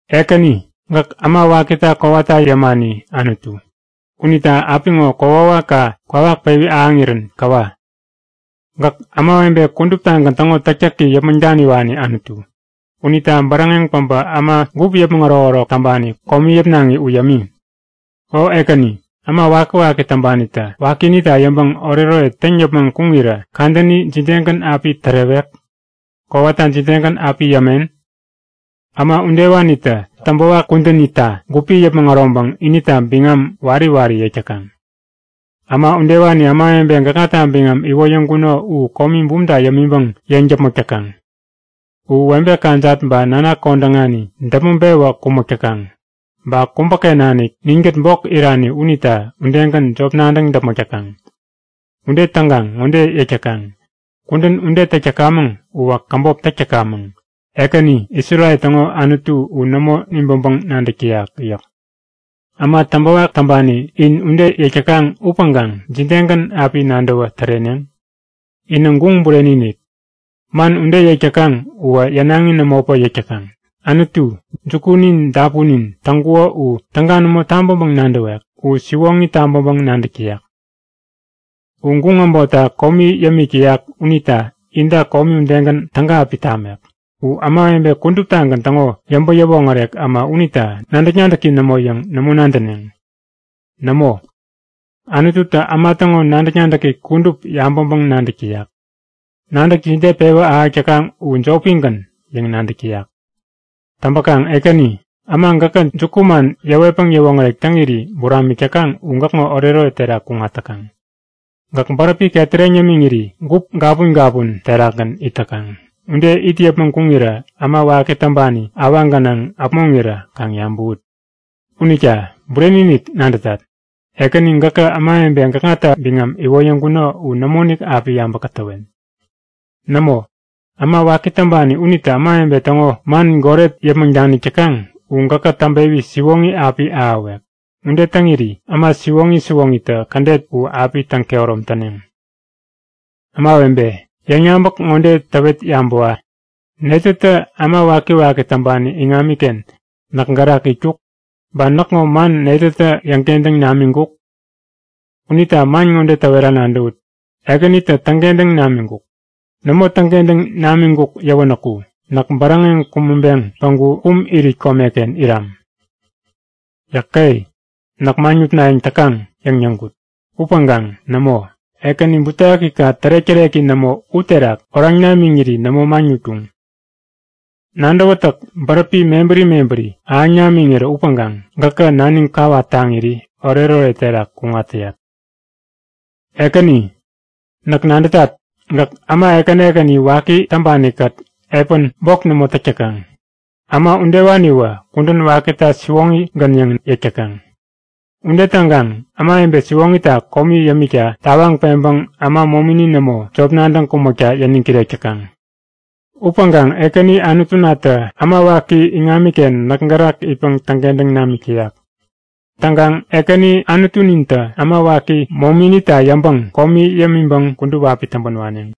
Ekäni, gäk äma wakita kowata yämani Anutu. Unita apiŋo kokwawakka kwawak pewi ahäŋirän käwa! Gäk ämawebe kuduptagän täŋo täktäki yäpmäŋ daniwani Anutu. Unita bäräŋeŋ päbä äma gup yäpmäŋ ärokärok täŋpani komi yäpnaŋi u yämi! O Ekäni, äma wakiwaki täŋpanitä wakinita yäŋpäŋ oretoret täŋ yäpmäŋ kuŋirä kadäni jidegän api tärewek? Kowata jidegän api yämen? Äma udewanitä täŋpäwak kudänita gupi yäpmäŋ äroŋpäŋ inita biŋam wari wari yäk täkaŋ. Äma udewani ämawebe gäkŋata biŋam iwoyäŋkuno u komi bumta yämiŋpäŋ yeŋ däpmäk täkaŋ. U webe kajat ba nanak kodäŋani däpmäŋ-pewä kumäk täkaŋ. Ba kubäken nanik ninkät bok irani unita udegän jop nadäŋ däpmäk täkaŋ. Ude täŋkaŋ ŋode yäk täkaŋ; Kudän ude täk tämaŋ uwä käbop täk tämamäŋ. Ekäni, Isrel täŋo Anutu u nämo nibäŋpäŋ nadäk täyak yäk. Äma täŋpäwak täŋpani in ude yäk täkaŋ upäŋkaŋ jidegän api nadäwä täreneŋ? Inä guŋ bureni-inik! Man ude yäk täkan uwä yänaŋi nämopäŋ yäk täkaŋ. Anutu, jukunin dapunin täŋkuko u täga nämo tabäŋpäŋ nadäwek? U siwoŋi tabäŋpäŋ-nadäk tayak! U guŋ äbotta komi yämik täyak unita inta komi udegän täga api tamek. U ämawebe kuduptagän täŋo yäŋpäŋ-yäwoŋärek äma unita nadäk-nadäki nämo yäŋ nämo nadäneŋ. Nämo! Anututä äma täŋo nadäk-nadäki kudup yabäŋpäŋ-nadäk täyak. Nadäk jide pewä ahäk täkaŋ u jopigän yäŋ nadäk täyak. Täŋpäkaŋ Ekäni, äma gäkä jukuman yäwetpäŋ yäwoŋärek täŋiri buramik täkaŋ u gäkŋo oretoret terakgän kuŋat täkaŋ. Gäk bäräpi ketäreŋ yämiŋiri gup gapun gapun terakgän it täkaŋ. Ude it yäpmäŋ kuŋirä äma waki täŋpani awaŋ gänaŋ äpmoŋirä kaŋ yabäwut! Unita bureni-inik nadätat, Ekäni gäkä ämawebe gäkŋata biŋam iwoyäŋkuno u nämoinik api yabä-kätäwen. Nämo, äma waki täŋpani unitä ämawebe täŋo man goret yäpmäŋ danik täkaŋ u gäkä täŋpewi siwoŋi api ahäwek. Ude täŋiri äma siwoŋi siwoŋitä kädet u api täŋ-kehärom täneŋ. Ämawebe, yäŋyabäk ŋode täwet yabäwa; Netätä äma wakiwaki täŋpani iŋamiken näk gärak itkuk? Ba näkŋo man netätä yäŋkentäŋ namiŋkuk? Unita man ŋode täwera nadäwut; Ekänitä täŋkentäŋ namiŋkuk! Nämo täŋkentäŋ namiŋkuk yäwänäku näk bäräŋeŋ kumäŋpeŋ päŋku kum irit komeken iram. Yäke! Näk maŋ nutnayäŋ täkaŋ! yäŋ yäŋkut. Upäŋkaŋ nämo! Ekäni, butewakika tärek-täreki nämo u terak oraŋ namiŋiri nämo maŋ nutkuŋ. Nadäwätäk bäräpi mebäri mebäri ahäŋ namiŋirä upäkaŋ gäkä naniŋ kawat taŋiri oretoret terak kuŋat täyat. Ekäni, näk nadätat. Gäk äma ekäni ekäni waki täŋpanikät epän bok nämo täk täkaŋ. Äma udewaniwä kudän wakita siwoŋigän yäŋ yäk täkaŋ. Ude täŋkaŋ ämawebe siwoŋita komi yämikta tawaŋ peŋpäŋ äma momini nämo, jop nadäŋ kumäkta yäniŋ kirek täkaŋ. Upäŋkaŋ Ekäni Anutunatä äma waki iŋamiken näk gärak itpäŋ täŋkentäŋ namik täyak. Täŋkaŋ Ekäni Anutunintä äma waki mominita yäŋpäŋ komi yämiŋpäŋ kudup api täŋpän waneŋ.